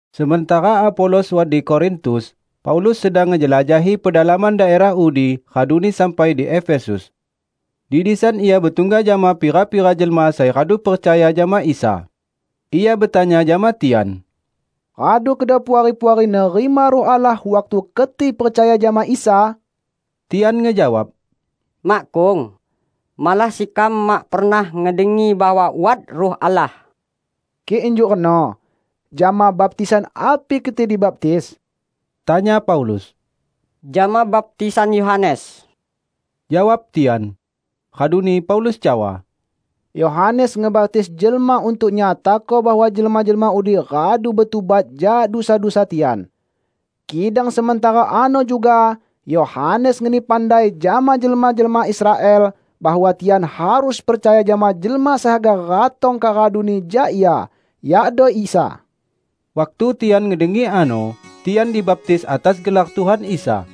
Sementara Apolos wat di Korintus, Paulus sedang ngejelajahi pedalaman daerah udi raduni sampai di Efesus. Di disan ia betungga jama pira-pira jelma sai radu percaya jama Isa. Ia betanya jama tian, "Radu kedo Puari-puari nerima Ruh Allah waktu keti percaya jama Isa?" Tian ngejawab, "Makkung. Malah sekam mak pernah ngedengi bahwa wat Ruh Allah." "Kik injuk reno, jama baptisan api keti dibaptis?" tanya Paulus. "Jama baptisan Yohanes," jawab tian. Raduni Paulus cawa, "Yohanes ngebaptis jelma untuk nyatako bahwa jelma-jelma udi radu betubat jak dusa-dusa tian. Kidang sementara ano juga Yohanes ngeni pandai jama jelma-jelma Israel bahwa tian harus percaya jama Jelma sai haga ratong kak raduni jak ia, yakdo Isa." Waktu tian ngedengi ano, tian dibaptis atas gelar Tuhan Isa.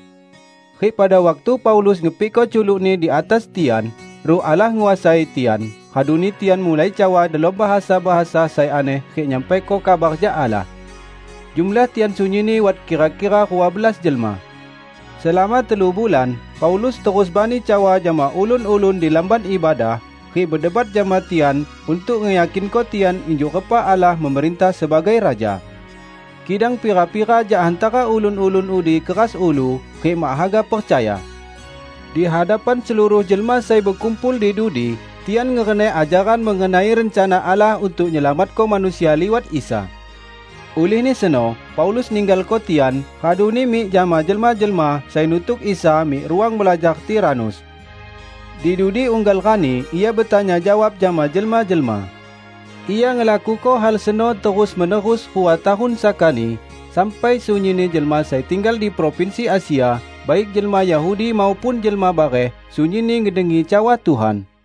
Rik pada waktu Paulus ngepikko culukni di atas tian, Ruh Allah nguasai tian, raduni tian mulai cawa delom bahasa-bahasa sai aneh rik nyampaiko kabar jak Allah. Jumlah tian sunyinni wat kira-kira rua belas jelma. Selama telu bulan Paulus terus bani cawa jama ulun-ulun di lamban ibadah rik bedebat jama tian untuk ngeyakinko tian injuk repa Allah memerintah sebagai Raja. Kidang pira-pira jak hantara ulun-ulun udi keras ulu rik mak haga percaya. Di hadapan seluruh jelma sai bekumpul di dudi tian ngereneh ajaran mengenai rencana Allah untuk nyelamatko manusia liwat Isa. Ulihni seno Paulus ninggalko tian, raduni mik jama jelma-jelma sai nutuk Isa mik ruang belajar Tiranus. Di dudi unggal rani ia betanya jawab jama jelma-jelma. Ia ngelakuko hal seno terus-menerus rua tahun sakani sampai sunyinni jelma sai tinggal di provinsi Asia, baik jelma Yahudi maupun jelma bareh, sunyinni ngedengi cawa Tuhan.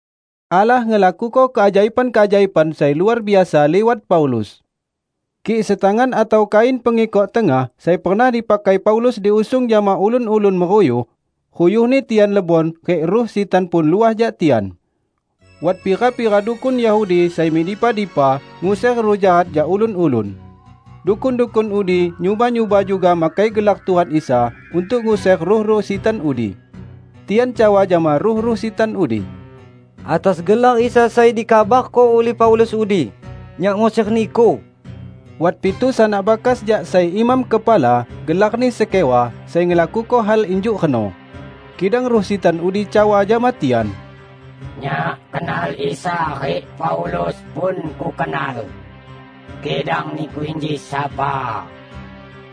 Allah ngelakuko keajaiban-keajaiban sai luar biasa liwat Paulus. Kik setangan atau kain pengikok tengah sai pernah dipakai Paulus diusung jama ulun-ulun meruyuh, ruyuhni tian lebon rik ruh sitan pun luah jak tian. Wat pira-pira dukun Yahudi sai mik dipa-dipa, nguser ruh jahat jak ulun-ulun. Dukun-dukun udi nyuba-nyuba juga makai gelar Tuhan Isa untuk nguser ruh-ruh sitan udi. Tian cawa jama ruh-ruh sitan udi, "Atas gelar Isa sai dikabarko ulih Paulus udi, nyak nguser niku!" Wat pitu sanak bakas jak sai imam kepala, gelarni Skewa, sai ngelakuko hal injuk reno. Kidang ruh sitan udi cawa jama tian, "Nyak kenal Isa rik Paulus pun kukenal, kidang niku inji sapa?"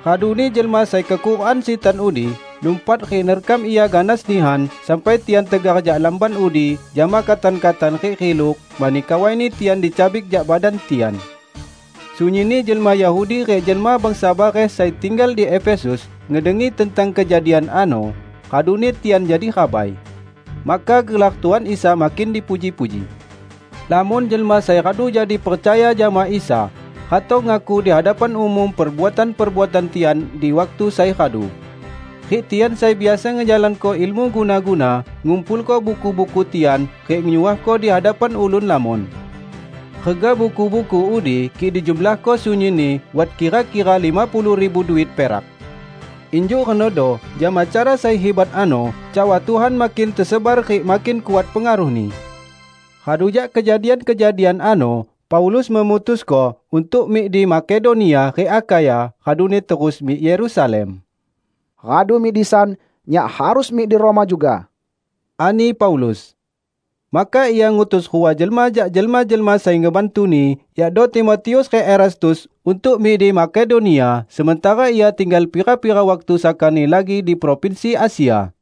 Raduni jelma sai kekurukan sitan udi lumpat rik nerkam ia ganas nihan sampai tian tegar jak lamban udi jama katan-katan rik riluk, mani kawaini tian dicabik jak badan tian. Sunyinni jelma Yahudi rik jelma bangsa bareh sai tinggal di Efesus ngedengi tentang kejadian ano, raduni tian jadi rabai. Maka gelar Tuhan Isa makin dipuji-puji. Lamon jelma sai radu jadi percaya jama Isa, ratong ngaku di hadapan umum perbuatan-perbuatan tian di waktu sai radu. Rik tian sai biasa ngejalanko ilmu guna-guna, ngumpulko buku-buku tian rik nyuahko di hadapan ulun lamon. Rega buku-buku udi kik dijumlahko sunyinni wat kira-kira lima puluh ribu duit perak. Injuk renodo jama cara sai hibat ano cawa Tuhan makin tesebar rik makin kuat pengaruhni. Radu jak kejadian-kejadian ano, Paulus memutusko untuk mik di Makedonia rik Akhaya raduni terus mik Yerusalem. "Radu mik disan, nyak harus mik di Roma juga," ani Paulus. Maka ia ngutus rua jelma jak jelma-jelma sai ngebantuni, yakdo Timotius rik Erastus untuk mik di Makedonia, sementara ia tinggal pira-pira waktu sakani lagi di provinsi Asia.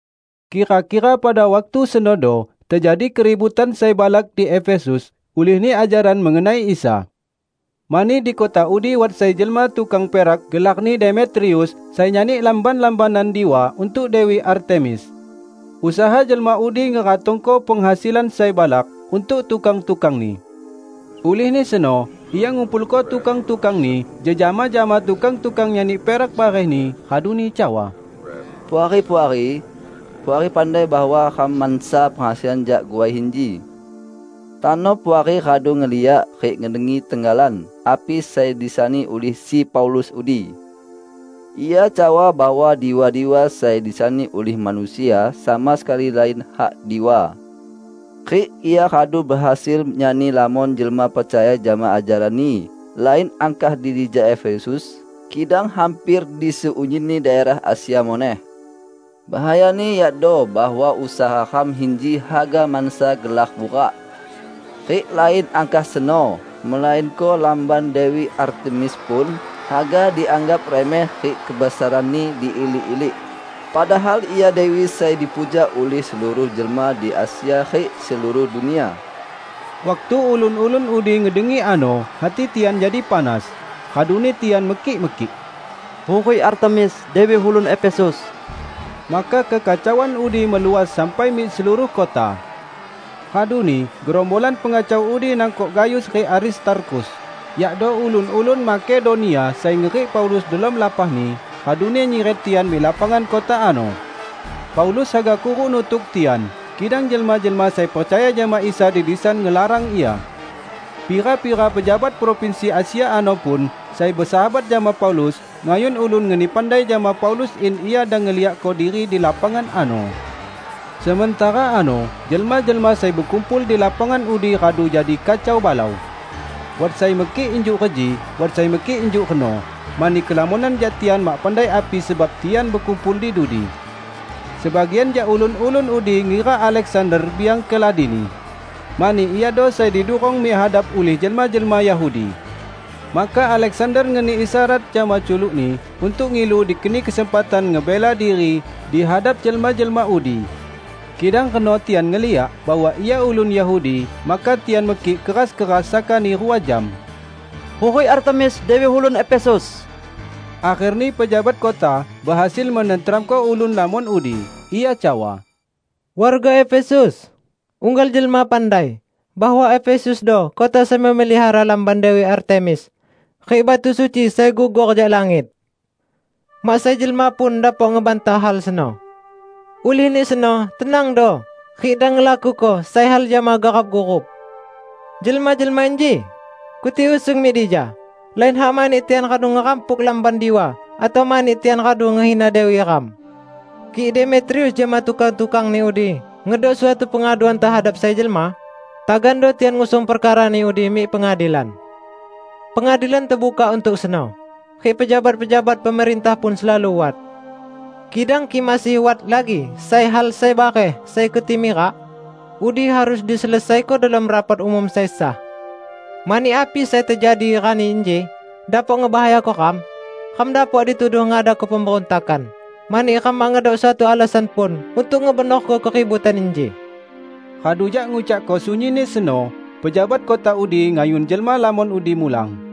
Kira-kira pada waktu senodo tejadi keributan sai balak di Efesus ulihni ajaran mengenai Isa. Mani di kota udi wat sai jelma tukang perak gelarni Demetrius, sai nyani lamban-lambanan diwa untuk Dewi Artemis. Usaha jelma udi ngeratongko penghasilan sai balak untuk tukang-tukangni. Ulihni seno ia ngumpulko tukang-tukangni jejama jama tukang-tukang nyani perak barehni, raduni cawa, "Puari-puari! Puari pandai bahwa ram mansa penghasilan jak guai inji. Tano Puari radu ngeliak rik ngedengi tenggalan api sai disani ulih si Paulus udi. Ia cawa bahwa diwa-diwa sai disani ulih manusia sama sekali lain hak diwa. Rik ia radu behasil nyani lamon jelma percaya jama ajaranni, lain angkah di dija di Efesus, kidang hamper di seunyinni daerah Asia muneh. Bahayani yakdo bahwa usaha ram inji haga mansa gelar burak. Rik lain angkah seno, melainko lamban Dewi Artemis pun haga dianggap remeh rik kebesaranni diilik-ilik; padahal ia dewi sai dipuja ulih seluruh jelma di Asia rik seluruh dunia!" Waktu ulun-ulun udi ngedengi ano hati tian jadi panas, raduni tian mekik-mekik, "Hurik Artemis, dewi ulun Efesus!" Maka kekacauan udi meluas sampai mik seluruh kota. Raduni gerombolan pengacau udi nangkok Gayus rik Aristarkhus, yakdo ulun-ulun Makedonia sai ngerik Paulus delom lapahni, raduni nyiret tian mik lapangan kota ano. Paulus haga kuruk nutuk tian, kidang jelma-jelma sai percaya jama Isa di disan ngelarang ia. Pira-pira pejabat provinsi Asia ano pun, sai besahabat jama Paulus, ngayun ulun ngeni pandai jama Paulus in ia dang ngeliakko diri di lapangan ano. Sementara ano jelma-jelma sai bekumpul di lapangan udi radu jadi kacau balau. Wat sai mekik injuk reji, wat sai mekik injuk reno, mani kelamonan jak tian mak pandai api sebab tian bekumpul di dudi. Sebagian jak ulun-ulun udi ngira Aleksander biang keladini, mani iado sai didurong mik hadap ulih jelma-jelma Yahudi. Maka Aleksander ngeni isyarat jama culukni untuk ngilu dikeni kesempatan ngebela diri di hadap jelma-jelma udi. Kidang reno tian ngeliak bahwa ia ulun Yahudi, maka tian mekik keras-keras sakani rua jam, "Hurik Artemis, dewi ulun Efesus!" Akherni pejabat kota behasil menenteramko ulun lamon udi. Ia cawa, "Warga Efesus! Unggal jelma pandai bahwa Efesusdo kota sai memelihara lamban Dewi Artemis rik batu suci sai gugor jak langit. Mak sai jelma pun dapok ngebantah hal seno. Ulihni seno tenangdo rik dang ngelakuko sai hal jama garap-gurup. Jelma-jelma inji, keti usung mik dija lain hak mani tian radu ngerampuk lamban diwa atau mani tian radu ngehina dewi ram. Kik Demetrius jama tukang-tukangni udi ngedok suatu pengaduan tehadap sai jelma, tagando tian ngusung perkarani udi mik pengadilan. Pengadilan tebukak untuk seno rik pejabat-pejabat pemerintah pun selalu wat. Kidang kik masih wat lagi sai hal sai bareh sai keti mirak, udi harus diselesaiko delom rapat umum sai sah. Mani api sai tejadi rani inji dapok ngebahayako ram. Ram dapok dituduh ngadako pemberuntakan, mani ram mak ngedok suatu alasan pun untuk ngebenorko keributan inji." Radu jak ngucakko sunyinni seno, pejabat kota udi ngayun jelma lamon udi mulang.